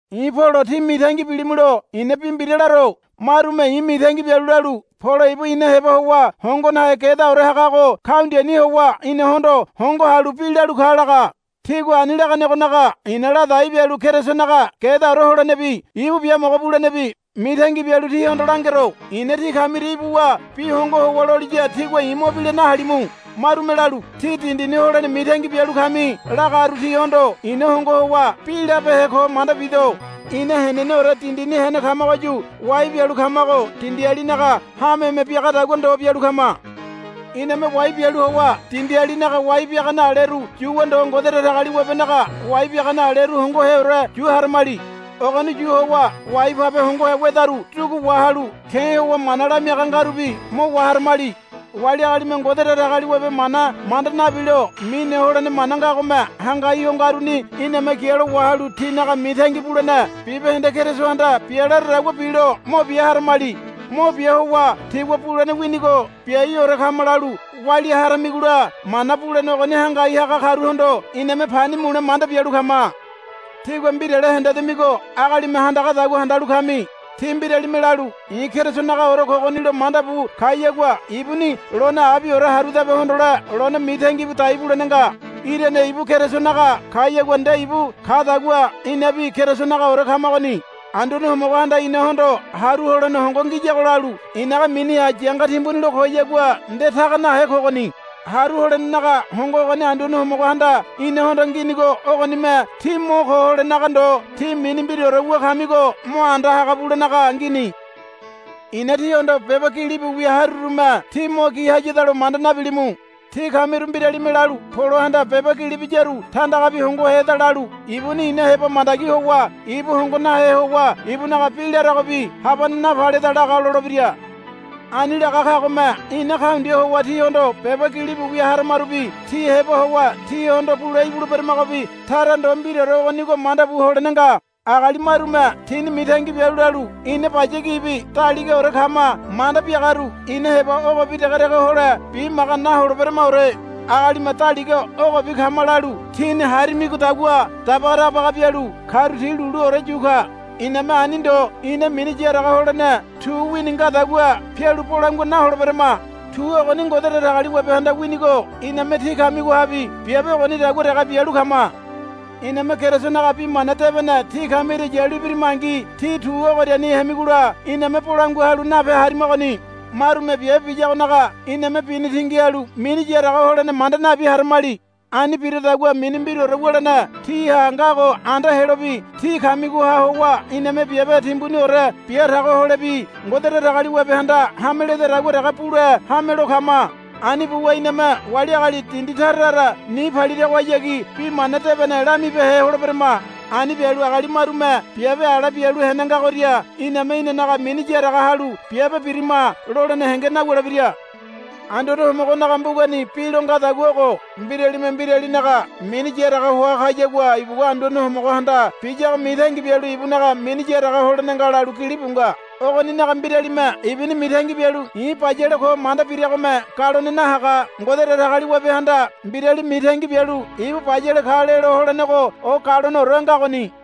I̱ Polo tí mitangi bilimulo i̱na bi mbira laro. Marume i̱ mitangi bialu lalu, Polo ibu ina heba howa hongo nahe gedaore hagago kaundiani howa inahondo hongo halu bi lalu ka, laga. Tigua ani laganegonaga i̱na ladai bialu Kerisonaga gedaore holenebi ibu biamogo bulenebi mitangi bialu tíhondo langero. I̱na tí kamiria ibuwa bi hongo howa loliya tígua bi mo la nahalimu. Marume lalu, Tí dindini holene mitangi biaga kami, lagaru tihondo i̱na hongo howa bi labehe ko manda bido. Ina heneneore dindini hene kamagoyu wai bialu kamago dindialinaga hameme biagadagua ndo bialu kama. Iname wai bialu howa dindialinaga wai biagane aleru yuwa ndo Ngode Datagaliwabenaga wai biagane aleru hongoheore yu haramali. Ogoni yu howa wai pabe hongohe wedaru dugu wahalu ke̱ howa mana lamiaga ngarubi mo waharamali. Wali agalime Ngode Datagaliwabe mana manda nabilo mine holene mana ngagome hangai ho ngaruni iname gialo wahalu tinaga mitangi bulene bibahende Kerisohanda bia laradagua bilo mo bia haramali. Mo bia howa tígua bulene winigo biaiore kama lalu walia haramigola mana bulene ogoni hangai haga karuhondo iname pani mule manda bialu kama. Tígua mbirale hendedamigo agalime handagadagua handalu kami. Tí mbiralime lalu, I̱ Kerisonagaore kogonilo, manda bu kayagua ibuni lone abiore harudabe hondole lone mitangi bu dai bulene nga. Irane ibu Kerisonaga kayagua nde ibu kadagua inabi Kerisonagaore kamagoni. Anduane Homogohanda inahondo haru holene hongo ngiyago lalu i̱naga miniha yanga timbuni lo koyagua nde taga nahe kogoni. Haru holenenaga hongo ogoni Anduane Homogohanda inahondo nginigo ogonime tí mo ko holenaga ndo tí mini mbiraore wu kamigo mo anda haga bulenaga ngini. I̱na tíhondo beba gilibu wia harurume tí mo gi hayadalo manda nabilimu. Tí kamiru mbiralime lalu, Polohanda beba gili biyaru tandagabi hongoheda, lalu, Ibuni ina heba mandagi howa ibu hongo nahe howa ibunaga bi laragobi habane napaleda laga, lolebira. Ani laga kagome ina kaundia howa tíhondo beba gilibu wia haramarubi tí heba howa tíhondo bule ibuleberamagobi tara ndo mbiraore ogonigo manda bu holene nga. Agali marume tini mitangi bialu lalu, Ina baya gibi daligaore kama, manda biagaru ina heba ogobi degedege hole bimaga naholeberamaore. Agalime daliga ogobi kama, lalu tini harimidagua dabaga dabaga bialu karu ti luluore yu ka. Iname ani ndo ina mini yaraga holene tu wini ngadagua pialu bolangua naholeberama. Tu ogoni Ngode Datagaliwabehanda winigo iname tí kamigohabi biabe ogonidagua dege bialu kama. Iname Kerisonaga Bi Mana Debene tí kamiria yalu ibirimangi tí tu ogoriani hemigola iname bolangua halu nape harimagoni. Marume biabe biyagonaga iname bini tingi halu mini yaraga holene manda nabi haramali. Ani biradagua mini mbiraore wulene tíha ngago anda helobi tí kamigoha howa iname biabe timbuniore bia tago holebi Ngode Datagaliwabehanda hameledadagua dege bule hamelo kama. Ani buwa iname wali agali dindi tara tara ni paliragohayagi Bi Mana Debene lamibehe holeberama. Ani bialu agali marume biabe ala bialu hene ngagoria iname inanaga mini yaraga halu, Biabe birima, lolene henge nawulebira. Anduane Homogonaga mbugani bi lo ngadagua ogo, Mbiralime mbiralinaga mini yaraga hoa kayagua ibugua Anduane Homogohanda biyago mitangi bialu ibunaga mini yaraga holene nga, lalu gilibu nga. Ogoninaga mbiralime ibuni mitangi bialu, I̱ bayale ko, manda biragome galone nahaga. Ngode Datagaliwabehanda mbirali mitangi bialu ibu bayale ka lelo holenego o galoneore ngagoni.